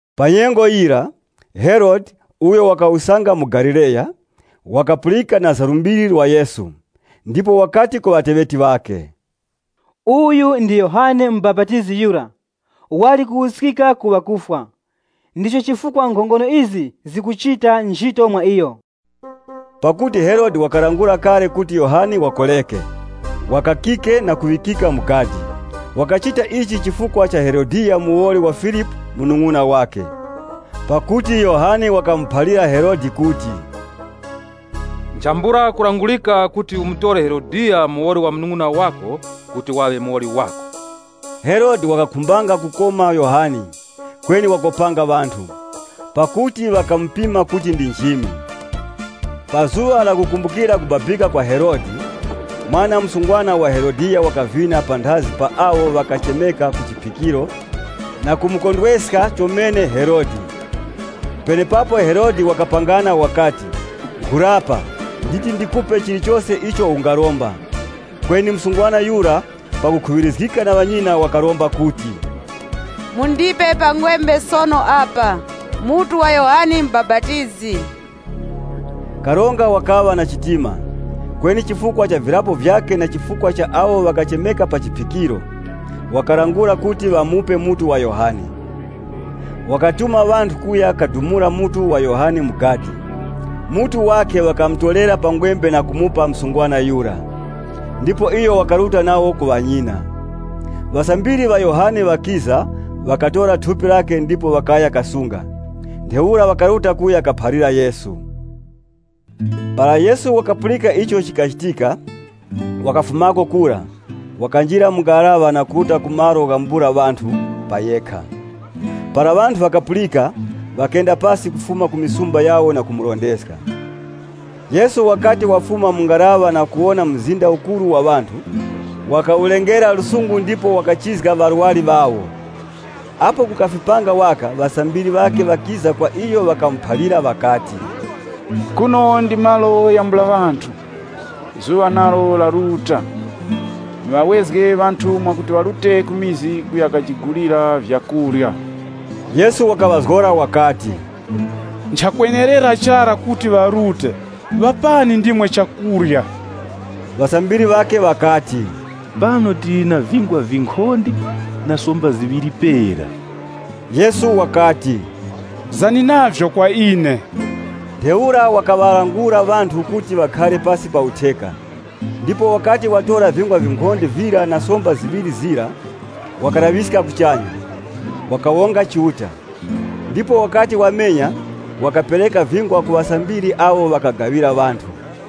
Pa nyengo yira, Herode, uyo wakawusanga mu Galileya, wakapulika na za lumbiri lwa Yesu. Ndipo wakati ku ŵateŵeti ŵakhe, “Uyu ndi Yohane Mubapatizi yura! Wali kuwuskika ku ŵakufwa. Ndicho chifukwa nkhongono izi zikuchita nchito mwa iyo.” Pakuti Herode wakalangula kale kuti Yohane wakoreke, wakakike na kuŵikika mu gadi. Wakachita ichi chifukwa cha Herodiya muwoli wa Filipu munung'una wakhe. Pakuti Yohane wakamuphalira Herode kuti, “Nchambula kulangurika kuti umutore Herodiya muwoli wa munung'una wako kuti waŵe muwoli wako.” Herode wakakhumbanga kumukoma Yohane, kweni wakopanga ŵanthu, pakuti ŵakamupima kuti ndi nchimi. Pa zuŵa lakukumbukira kubabika kwa Herode, mwana msungwana wa Herodiya wakavina panthazi pa awo ŵakachemeka ku chiphikiro ndipo wakamukondweska chomene Herode. Penepapo Herode wakapangana wakati, “Nkhurapa, nditi ndikupe chilichose icho ungaromba.” Kweni msungwana yura, pakukhuŵirizgika na ŵanyina, wakaromba wakati, “Mundipe pa ngwembe sono apa, mutu wa Yohane Mubapatizi.” Karonga wakaŵa na chitima. Kweni chifukwa cha virapo vyakhe na chifukwa cha awo ŵakachemeka pa chiphikiro, wakalangula kuti ŵamupe mutu wa Yohane. Wakatuma ŵanthu kuya kadumula mutu wa Yohane mu gadi. Mutu wakhe ŵakawutorera pa ngwembe na kumupa msungwana yura, ndipo iyo wakaruta nawo ku ŵanyina. Ŵasambiri ŵa Yohane ŵakiza, ŵakatora thupi lakhe ndipo ŵakaya kasunga. Ntheura ŵakaruta kuya kamuphalira Yesu. Para Yesu wakapulika icho chikachitika, wakafumako kura, wakanjira mu ngaraŵa na kuruta ku malo ghambula ŵanthu pa yekha. Para ŵanthu ŵakapulika, ŵakenda pasi kufuma ku mizi yawo na kumurondezga. Yesu wakati wafuma mu ngaraŵa na kuwona mzinda ukuru wa ŵanthu, wakaŵa na chiwuravi na iwo ndipo wakachizga ŵarwari ŵawo. Apo kukafipanga waka, ŵasambiri ŵakhe ŵakiza kwa iyo, ŵakamuphalira ŵakati, “Kuno ndi malo ghambula ŵanthu, zuŵa nalo laruta. Muŵawezge ŵanthu mwakuti ŵarute ku vikaya kuya kajigulira vyakurya.” Yesu wakaŵazgora wakati, “Nchakwenerera chara kuti ŵarute, ŵapani ndimwe chakurya.” Ŵasambiri ŵakhe ŵakati, “Pano tili na vingwa vinkhonde na somba ziŵiri pera.” Yesu wakati, “Zani navyo kwa ine.” Ntheura wakaŵalangula ŵanthu kuti ŵakhare pasi pa utheka. Ndipo wakati watora vingwa vinkhonde vira na somba ziŵiri zira, wakalaŵiska kuchanya, wakawonga Chiuta, ndipo wakati wamenya wakapereka vingwa ku ŵasambiri awo ŵakagaŵira ŵanthu.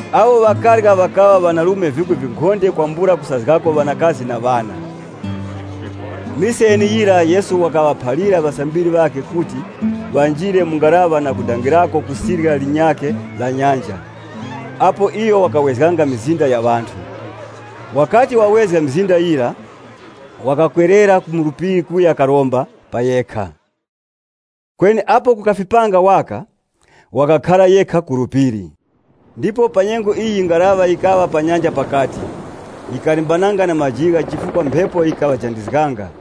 Awo ŵakarya ŵakaŵa ŵanarume vikwi vinkhonde kwambula kusazgako ŵanakazi na ŵana. Mise yeneyira Yesu wakaŵaphalira ŵasambiri ŵakhe kuti ŵanjire mu ngaraŵa na kudangirako ku sirya linyakhe la nyanja, apo iyo wakawezganga mizinda ya ŵanthu. Wakati wawezga mizinda yira, wakakwerera mu phiri kuya karomba pa yekha. Kweni apo kukafipanga waka, wakakhara yekha ku phiri. Ndipo pa nyengo iyi ngaraŵa yikaŵa pa nyanja pakati, yikalimbananga na majigha chifukwa mphepo yikaŵajandizganga.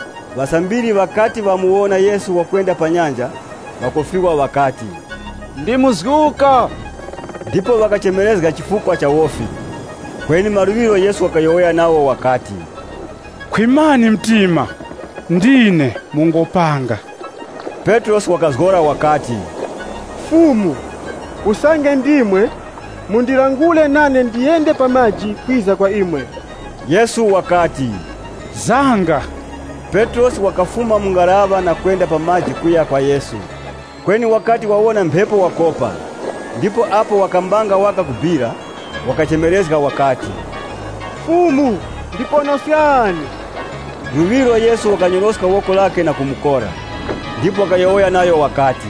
Ŵasambiri ŵakati ŵamuwona Yesu wakwenda pa nyanja, ŵakofiwa ŵakati, “Ndi muzguka!” Ndipo ŵakachemerezga chifukwa cha wofi. Kweni maluŵiro Yesu wakayowoya nawo wakati, “Khwimani mtima, ndine, mungopanga.” Petrosi wakazgora wakati, “Fumu, usange ndimwe, mundilangure nane ndiyende pa maji kwiza kwa imwe.” Yesu wakati, “Zanga!” Petrosi wakafuma mu ngaraŵa na kwenda pa maji kuya kwa Yesu. Kweni wakati wawona mphepo wakopa, ndipo apo wakambanga waka kubira, wakachemerezga wakati, “Fumu, ndiponoskani!” Luŵiro Yesu wakanyoroska woko lakhe na kumukora, ndipo wakayowoya nayo wakati,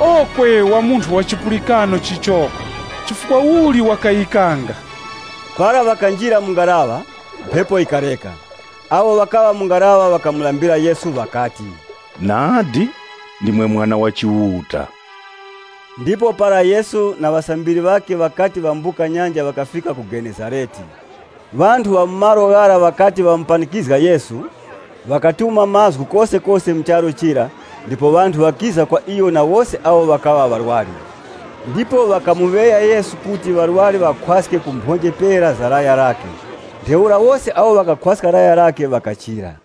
“Okwe, wa munthu wa chipulikano chichoko! Chifukwa uli wakayikanga?” Para ŵakanjira mu ngaraŵa, mphepo yikareka. Awo ŵakaŵa mu ngaraŵa ŵakamulambira Yesu, ŵakati, “Nadi, ndimwe Mwana wa Chiuta!” Ndipo para Yesu na ŵasambiri ŵakhe ŵakati ŵambuka nyanja ŵakafika ku Mutezarete. Ŵanthu ŵa mu malo ghara ŵakati ŵamupanikizga Yesu, ŵakatuma mazgu kosekose mu charu chira ndipo ŵanthu ŵakiza kwa iyo na wose awo ŵakaŵa ŵarwari. Ndipo ŵakamuŵeya Yesu kuti ŵarwari ŵakhwaske ku mphonje pera za laya lakhe. Ntheura wose awo ŵakakhwaska laya lakhe ŵakachira.